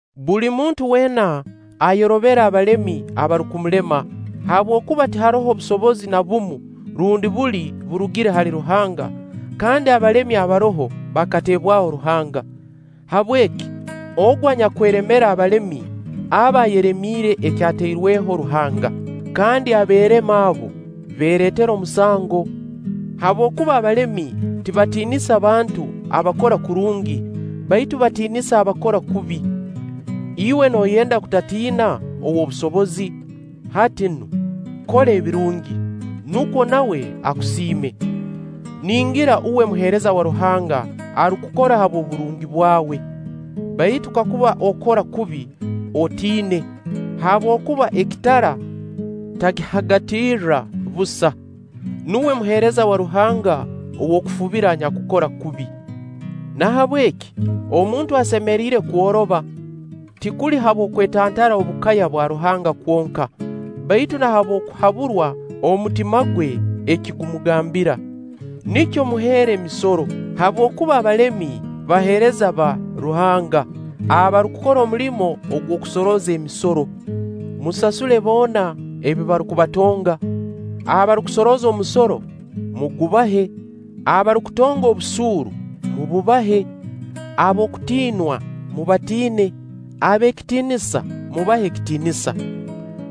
Buli muntu weena ayorobere abalemi abarukumulema, habwokuba tiharoho busobozi na bumu rundi buli burugire hali Ruhanga; kandi abalemi abaroho bakateebwaho Ruhanga. Habweki, ogu anyakweremera abalemi, aba ayeremiire ekyatairweho Ruhanga. Kandi abeereme abo, beereetera omusango. Habwokuba abalemi tibatiinisa bantu abakora kurungi, baitu batiinisa abakora kubi. Iwe nooyenda kutatiina ow'obusobozi? Hati nu, kora ebirungi, nukwo nawe akusiime. Ningira uwe muheereza wa Ruhanga arukukora habw'oburungi bwawe. Baitu kakuba okora kubi, otiine; habwokuba ekitara takihagatiirra busa. Nuwe muheereza wa Ruhanga ow'okufubira anyakukora kubi. Nahabweki omuntu asemeriire kworoba, tikuli habw'okwetantara obukaya bwa Ruhanga kwonka, baitu na habw'okuhaburwa omutima gwe eki gumugambira. Nikyo muheera emisoro, habwokuba abalemi baheereza ba Ruhanga, abarukukora omulimo agw'okusorooza emisoro. Musasule boona ebi barukubatonga: abarukusorooza omusoro, mugubahe; abarukutonga obusuuru, mububahe; ab'okutiinwa, mubatiine; ab'ekitiinisa, mubahe ekitiinisa.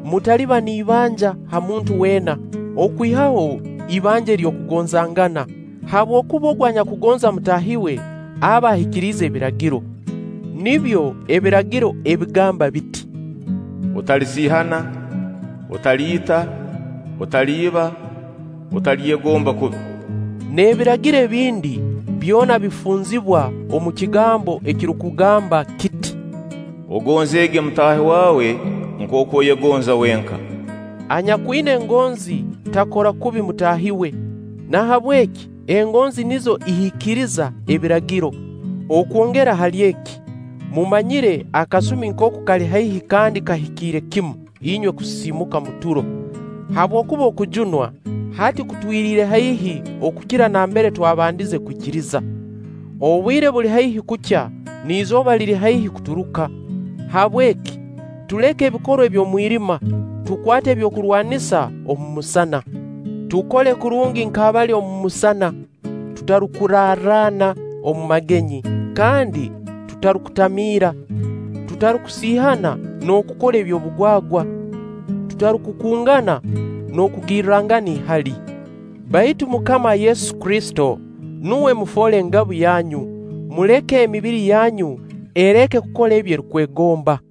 Mutaliba n'ibanja ha muntu weena, okwihaho ibanja ery'okugonzangana; habwokuba ogu anyakugonza mutaahi we, aba ahikiriize Ebiragiro. Nibyo Ebiragiro ebigamba biti: “Otalisiihana, otaliita, otaliiba, otalyegomba kubi” n'ebiragiro ebindi, byona bifunzibwa omu kigambo ekirukugamba kiti: “Ogonzeege mutaahi waawe nkooku oyegonza wenka.” Anyakwina egonzi takora kubi mutaahi we; nahabweki engonzi nizo ihikiriza Ebiragiro. Okwongera hali eki, mumanyire akasumi nkooku kali haihi kandi kahikiire kimu, inywe kusisiimuka omu turo; habwokuba okujunwa, hati kutwiriire haihi okukira nambere twabandize kwikiriza. Obwire buli haihi kukya, n'izooba liri haihi kuturuka. Habweki, tuleke ebikorwa eby'omwirima, tukwate eby'okurwanisa omu musana. Tukole kurungi nk'abali omu musana, tutarukurarraana omu magenyi kandi tutarukutamiira, tutarukusiihana n'okukora eby'obugwagwa, tutarukukungana n'okugirrangana ihali. Baitu MUKAMA Yesu Kristo nuwe mufoole ngabu yanyu, muleme emibiri yanyu, ereke kukora ebi erukwegomba.